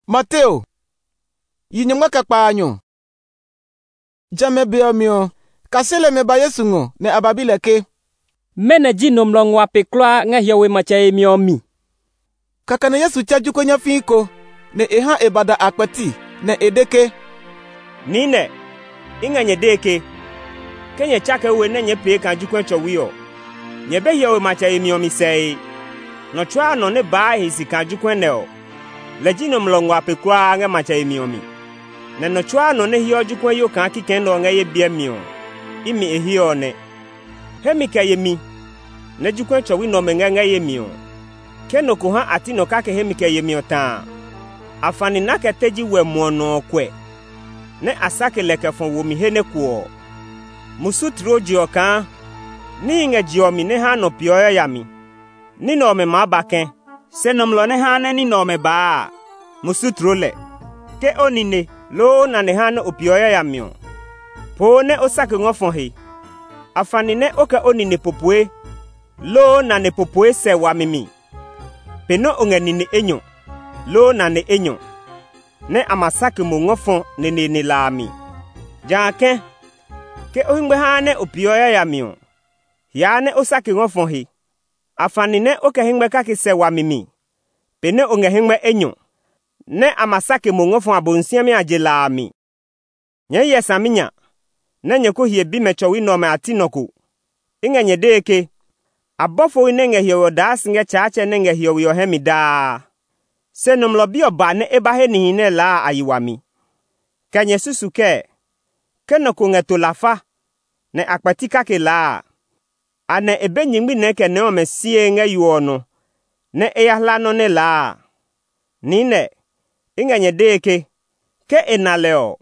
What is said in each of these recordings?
Mɛnɔ ji nɔmlɔ nguaa pe kulaa? Jamɛ a be ɔ mi ɔ, kaseli ɔmɛ ba Yesu ngɔ, nɛ a ba bi lɛ ke, “Mɛnɔ ji nɔmlɔ nguaa pe kulaa ngɛ hiɔwe matsɛ yemi ɔ mi?” Kɛkɛ nɛ Yesu tsɛ jokuɛ nyafii ko, nɛ e ha e ba da a kpɛti, nɛ e de ke, “Niinɛ, i ngɛ nyɛ dee ke, ke nyɛ tsakee we nɛ nyɛɛ pee kaa jokuɛ tsɔwi ɔ, nyɛ be hiɔwe matsɛ yemi ɔ mi sɛe. Nɔ tsuaa nɔ nɛ baa e he si kaa jokuɛ nɛ ɔ, lɛ ji nɔmlɔ nguaa pe kulaa ngɛ hiɔwe matsɛ yemi ɔ mi. Nɛ nɔ tsuaa nɔ nɛ heɔ jokuɛyo kaa kikɛ nɛ ɔ ngɛ ye biɛ mi ɔ, imi e he ɔ nɛ. “Hemi kɛ yemi nɛ jokuɛ tsɔwi nɛ ɔmɛ ngɛ ngɛ ye mi ɔ, ke nɔ ko ha nɛ a ti nɔ kake hemi kɛ yemi ɔ ta a, afani nɛ a kɛ teji wɛ muɔ nɔ ɔ kuɛ, nɛ a sake lɛ kɛ fɔ wo mi he nɛ kuɔ. Musu tloo je ɔ kaa níhi ngɛ je ɔ mi nɛ haa nɔ peeɔ yayami! Ní nɛ ɔmɛ maa ba kɛ̃, se nɔmlɔ nɛ haa nɛ ní nɛ ɔmɛ baa a, musu tloo lɛ! “Ke o nine, loo o nane haa nɛ o peeɔ yayami ɔ, poo nɛ o sake ngɔ fɔ he! Afani nɛ o kɛ nine popoe, loo nane popoe sɛ wami mi pe nɛ o ngɛ nine enyɔ, loo nane enyɔ, nɛ a ma sake mo ngɔ fɔ neneene la a mi. Jã kɛ̃, ke o hɛngmɛ haa nɛ o peeɔ yayami ɔ, hiaa nɛ o sake ngɔ fɔ he! Afani nɛ o kɛ hɛngmɛ kake sɛ wami mi pe nɛ o ngɛ hɛngmɛ enyɔ, nɛ a ma sake mo ngɔ fɔ Abosiami a je la a mi. “Nyɛɛ hyɛ saminya nɛ nyɛ ko hie bimɛ tsɔwi nɛ ɔmɛ a ti nɔ ko. I ngɛ nyɛ dee ke a bɔfohi nɛ ngɛ hiɔwe ɔ daa si ngɛ Tsaatsɛ nɛ ngɛ hiɔwe ɔ hɛ mi daa. [ Se Nɔmlɔ Bi ɔ ba nɛ e ba he nihi nɛ laa a a yi wami.] “Kɛ nyɛ susuu kɛɛ? Ke nɔ ko ngɛ to lafa, nɛ a kpɛti kake laa a, anɛ e be nyingmi nɛɛ kɛ nɛɛ ɔmɛ sie ngɛ yo ɔmɛ nɔ, nɛ e ya hla nɔ́ nɛ laa a? Niinɛ, i ngɛ nyɛ dee ke, ke e na lɛ ɔ,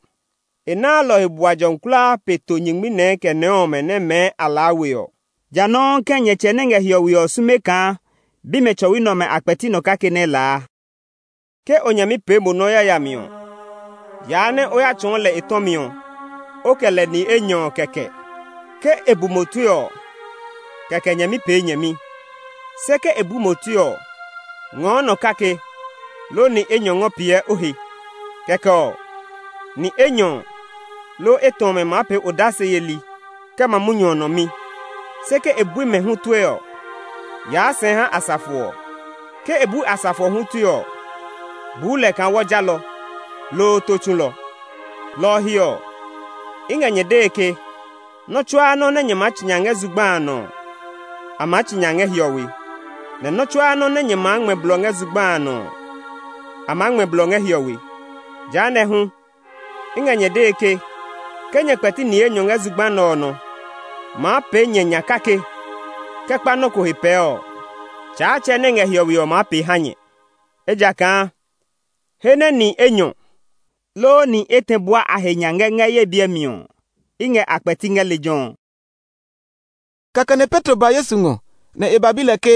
e naa lɔ ɔ he bua jɔmi kulaa pe to nyingmi nɛɛ kɛ nɛɛ ɔmɛ nɛ mɛɛ a laa we ɔ. Jã nɔuu kɛ̃ nyɛ Tsɛ nɛ ngɛ hiɔwe ɔ sume kaa bimɛ tsɔwi nɛ ɔmɛ a kpɛti nɔ kake nɛ laa. “Ke o nyɛmi pee mo yayami ɔ, yaa nɛ o ya tsɔɔ lɛ e tɔmi ɔ, o kɛ lɛ ni enyɔ kɛkɛ. Ke e bu mo tue ɔ, kɛkɛ nyɛmi pee nyɛmi. Se ke e bui mo tue ɔ, ngɔɔ nɔ kake, loo ni enyɔ ngɔ piɛ o he. Kɛkɛ ɔ, ni enyɔ, loo etɛ ɔmɛ maa pee odase yeli kɛ ma munyu ɔ nɔ mi. Se ke e bui mɛ hu tue ɔ, yaa sɛɛ ha asafo ɔ. Ke e bɛɛe bui asafo ɔ hu tue ɔ, buu lɛ kaa wɔ jalɔ, loo tó tsulɔ. “Lɔ ɔ he ɔ, i ngɛ nyɛ dee ke, nɔ́ tsuaa nɔ́ nɛ nyɛ maa tsi nya ngɛ zugba a nɔ ɔ, a maa tsi nya ngɛ hiɔwe, nɛ nɔ́ tsuaa nɔ́ nɛ nyɛ maa ngmɛ blɔ ngɛ zugba a nɔ ɔ, a maa ngmɛ blɔ ngɛ hiɔwe. “Jehanɛ ɔ hu, i ngɛ nyɛ dee ke, ke nyɛ kpɛti ni enyɔ ngɛ zugba nɛ ɔ nɔ maa pee nyɛ nya kake kɛ kpa nɔ́ ko he pɛɛ ɔ, Tsaatsɛ nɛ ngɛ hiɔwe ɔ maa pee ha nyɛ. Ejakaa he nɛ ni enyɔ, loo ni etɛ bua a he nya ngɛ ngɛ ye biɛ mi ɔ, i ngɛ a kpɛti ngɛ lejɛ ɔ.” Kɛkɛ nɛ Petro ba Yesu ngɔ, nɛ e ba bi lɛ ke,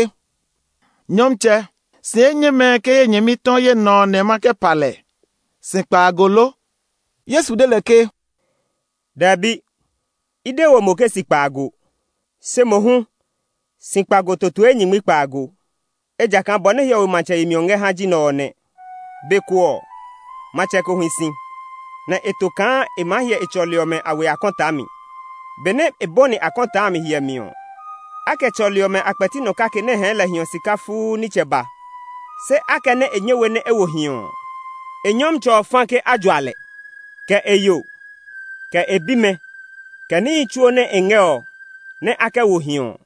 “Nyɔmtsɛ, si enyɛmɛ ke ye nyɛmi tɔ ye nɔ nɛ ma kɛ pa lɛ? Si kpaago lo?” Yesu de lɛ ke, “Dɛbi, i de we mo ke si kpaago, se mohu si kpaago totoe nyingmi kpaago. Ejakaa bɔ nɛ hiɔwe matsɛ yemi ɔ ngɛ ha ji nɛ ɔ nɛ. Be ko ɔ, matsɛ ko hi si, nɛ e to kaa e maa hyɛ e tsɔli ɔmɛ a we akɔtaa mi. Benɛ e bɔni akɔtaa a mi hyɛmi ɔ, a kɛ tsɔli ɔmɛ a kpɛti nɔ kake nɛ hɛɛ lɛ hiɔ sika fuu nitsɛ ba. Se akɛnɛ e nyɛ we nɛ e wo hiɔ ɔ, e nyɔmtsɛ ɔ fa ke a jua lɛ, kɛ e yo, kɛ e bimɛ, kɛ níhi tsuo nɛ e ngɛ ɔ nɛ a kɛ wo hiɔ ɔ.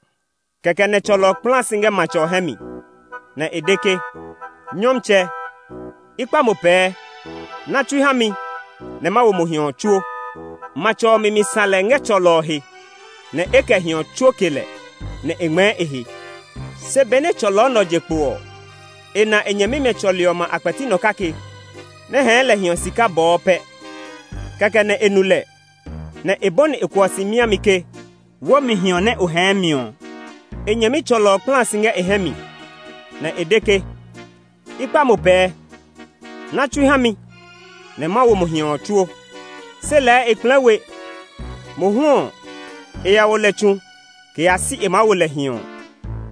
Kɛkɛ nɛ tsɔlɔ ɔ kpla si ngɛ matsɛ ɔ hɛ mi, nɛ e de ke, ‘Nyɔmtsɛ, i kpa mo pɛɛ, na tsui ha mi nɛ ma wo mo hiɔ ɔ tsuo!’ Matsɛ ɔ mi mi sã lɛ ngɛ tsɔlɔ ɔ he, nɛ e kɛ hiɔ ɔ tsuo ke lɛ, nɛ e ngmɛɛ e he. “Se benɛ tsɔlɔ nɛ ɔ je kpo ɔ, e na e nyɛmimɛ tsɔli ɔmɛ a kpɛti nɔ kake nɛ hɛɛ lɛ hiɔ sika bɔɔ pɛ. Kɛkɛ nɛ e nu lɛ, nɛ e bɔni e kuɔ si miami ke, ‘Wó mi hiɔ nɛ o hɛɛ mi ɔ!’ E nyɛmi tsɔlɔ ɔ kpla si ngɛ e hɛ mi, nɛ e de ke, ‘I kpa mo pɛɛ, na tsui ha mi nɛ ma wo mo hiɔ ɔ tsuo!’ Se lɛɛ e kplɛɛ we; mohu ɔ, e ya wo lɛ tsu kɛ yaa si e maa wo lɛ hiɔ ɔ.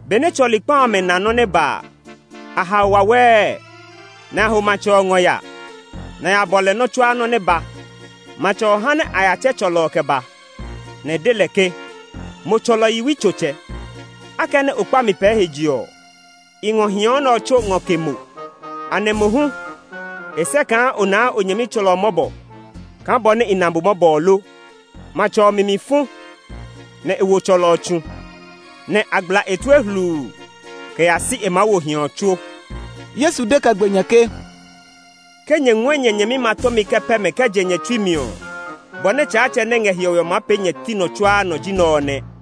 Benɛ tsɔli kpa amɛ na nɔ́ nɛ ba a, a hao wawɛɛ, nɛ a ho matsɛ ɔ ngɔ ya, nɛ a ya bɔ lɛ nɔ́ tsuaa nɔ́ nɛ ba. Matsɛ ɔ ha nɛ a ya tsɛ tsɔlɔ ɔ kɛ ba, nɛ e de lɛ ke, ‘Mo tsɔlɔ yiwutsotsɛ! Akɛnɛ o kpa mi pɛɛ he je ɔ, i ngɔ hiɔ nɛ ɔ tsuo ngɔ ke mo. Anɛ mo hu e sɛ kaa o naa o nyɛmi tsɔlɔ mɔbɔ kaa bɔ nɛ i na mo mɔbɔ ɔ lo?’ Matsɛ ɔ mi mi fu, nɛ e wo tsɔlɔ ɔ tsu, nɛ́ a gbla e tue hluu kɛ yaa si e maa wo hiɔ ɔ tsuo.” Yesu de kɛ gbe nya ke, “Ke nyɛ ngɔɛ nyɛ nyɛmimɛ a tɔmi ngɔ pɛ mɛ kɛ je nyɛ tsui mi ɔ, bɔ nɛ Tsaatsɛ nɛ ngɛ hiɔwe ɔ maa pee nyɛ ti nɔ tsuaa nɔ ji nɛ ɔ nɛ.”